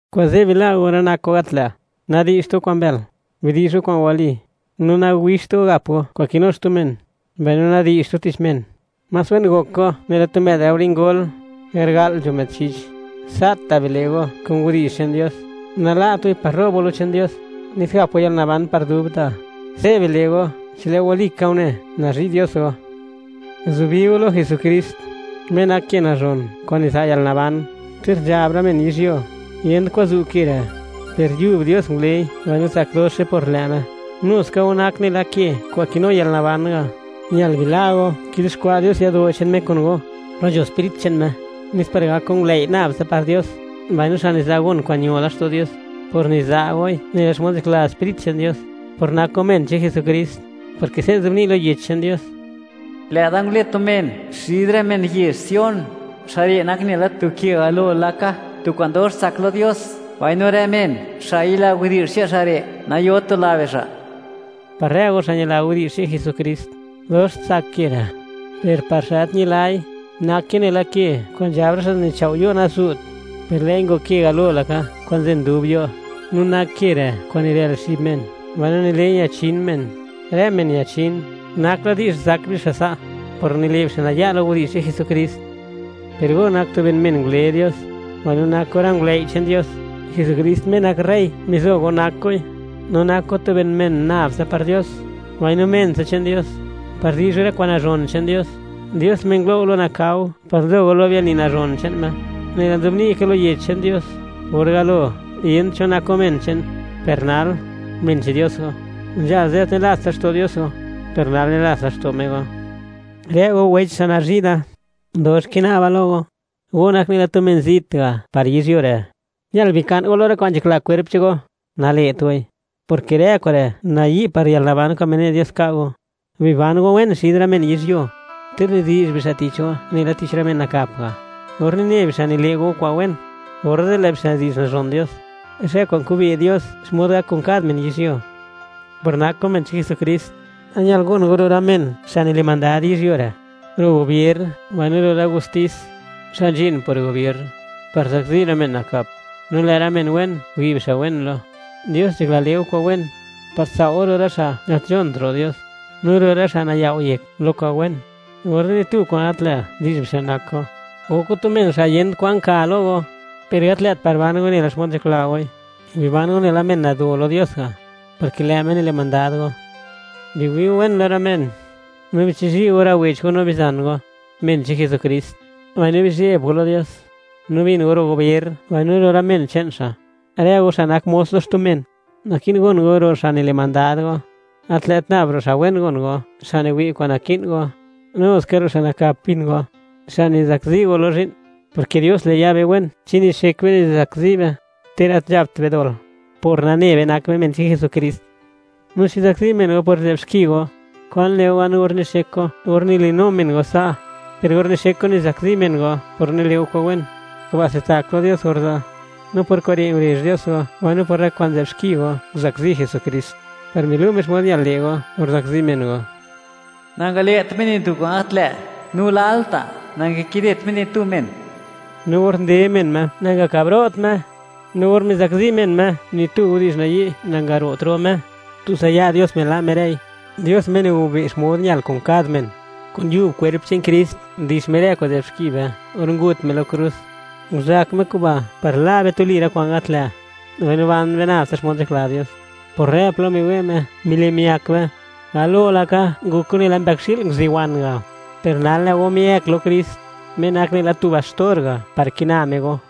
Kuze' bila' go rë nak kwa'n gat lë', nadi'zht go kwa'n mbël, bidi'zh go kwa'n wali; no nawixt go gap go kwa'n kinu xtu men, mbaino nadi'zht go tich men. Más wen gok go nela tu më'd laore ngol, garga'l nzho më'd chich; sa'ta' bile' go kun widi'zh che'n Dios, nala't goi par ro'b go lo che'n Dios, nes gap go yalnaban par dubta'. Se' bile' go, chi lë' go walika une, nazhi' Dios go. Guzubi go lo Jesukrist, Me nak ke nazhon kwa'n niza' yalnaban. Ter nzhab rë men yizhyuo, yent kwan zu' ke re', per yub Dios ngulei mbaino tsak doxe par lë' Me. Nuska go nak nela ke kwa'n kinu yalnaban ga'; ñal bila' go kizuxkwa' Dios yado' che'n Me kun go, plo nzho Sprit che'n Me, nes par gak go ngulëi' nab tsa par Dios, mbaino xa' niza' gon kwa'n ño laxto' Dios, por niza' goi nela xmod nzhakla Sprit che'n Dios, por nak go men che'n Jesukrist, porke se' nzobni' lo Yech che'n Dios: Lë'da ngule tu men xid rë men yezh Sion, xa' re' nak nela tu ke galo laka, tu kwa'n dox tsak lo Dios. Mbaino rë men xa' yila widi'zh che'n xa' re', nayot tula bixa'. Par rë go xa' ñila widi'zh che'n Jesukrist, dox tsak ke re': Per par xa' gat ñilai, nake nela ke kwa'n nzhab rë xa' nichao' yo', nazu't. Per lë'i ngok ke galo laka kwa'n nzen dub yo', no nak ke re' kwa'n nirël xib men, mbaino nile'i ñachin men. Rë men ñachin, nak la di'zh zak bixa' sa', por nile' bixa' naya' lo widi'zh che'n Jesukrist. Per go nak tu ben men ngule Dios, mbaino nak go rë ngulëi' che'n Dios, Jesukrist Me nak rey mizo go nak goi; no nak go tu ben men nab tsa par Dios, mbaino men tsa che'n Dios, par di'zh go rë kwa'n nazhon che'n Dios, Dios Me ngulo' go lo nakao par nzho go lo biani nazhon che'n Me. Nela nzobni' ka lo Yech che'n Dios: Or galo, yent cho che'n men nak go, per nal, men che'n Dios go; nzhala ze', gat nilast laxto' Dios go, per nal, nilats laxto' Me go. Rë go wecha, xa' nazhi' da; dox kina'ba lo go, go nak nela tu men zit ga' par yizhyuo re'; ñal bika'n go lo rë kwa'n nzhakla kwerp che'n go. Nale't goi, porke rë kure' nayi' par yalnaban kwa'n mine' Dios ka' go. Biban go wen xid rë men yizhyuo, ter nidi'zh bixa' tich go nela tich rë men nakap ga'. Or nine bixa' nile' go kwa'n wen, orze' lë' bixa' di'zh nazhon Dios, zhë kwa'n kube' Dios xmod gak kun kad men yizhyuo. Por nak go men che'n Jesukrist, ñal gon go ro' rë men xa' nile' mandad yizhyuo re'; ro' gobier, mbaino ro' rë gostis, xa' nzhin por gobier, par zakzi rë men nakap; no lë' rë men wen, wi' bixa' wen lo. Dios nzhakla le' go kwa'n wen, par tsao' go ro' rë xa' gat nzhont ro' Dios, no ro' rë xa' nayao' yek lo kwa'n wen, orze' ni tu kwa'n gat lë' di'zh bixa' nak go. Gok go tu men xa' yent kwan ka lo go, per gat lë't par ban goi nela xmod nzhakla goi; biban go nela men nguzi' Dios ga', porke lë' Me nile' mandad go. Biwi' go wen lo rë men, no bichizhi' go rë wech go no bizan go, men che'n Jesukrist; mbaino bizheb go lo Dios, no bin go ro' gobier mbaino ro' rë men che'n xa'. Rë go xa' nak mos lo xtu men, naki'n gon go ro' xa' nile' mandad go, gat lë't nab ro' xa' wen gon go, xa' niwi' kwa'n naki'n go; nu ska ro' xa' nakap bin go, xa' nizakzi go lo zhi'n; porke Dios le' ya be wen chi nixek be nizakzi be, ter gat nzhapt be dol, por nane be, nak be men che'n Jesukrist. No chi zakzi men go por nzë'b xki go, ¿kwan le' go gan or nixek go or nilinu men go sa'? Per or nixek go nizakzi men go por nile' go kwa'n wen, kuba'se tsak lo Dios orze'. No por kure' ngurezh Dios go, mbaino por rë kwa'n nzë'b xki go nguzakzi Jesukrist, par milu' Me xmod ñal le' go or zakzi men go. Nangale't Me ni tu kwa'n gat lë', no lalta' nangakidet Me ni tu men. No or nde men Me, nangakabro't Me; no or mizakzi men Me, ni tu widi'zh nayi' nangaro't ro' Me; tutsa ya' Dios mila' Me rëi, Dios Me nigobe' xmod ñal kun kad men. Kun yub kwerp che'n Krist, ndix Me rë kwa'n nzë'b xki be, or ngut Me lo krus. Nguzak Me kuba' par la' be tuli rë kwa'n gat lë', mbaino ban be nab tsa xmod nzhakla Dios. Por rë plo miwe' Me, mile' miak be. Galo laka, ngok go nela mbëkxi'l nguzuwan ga', per nal lë' go miëëk lo Krist, Me nak nela tu baxtor ga', par kina Me go.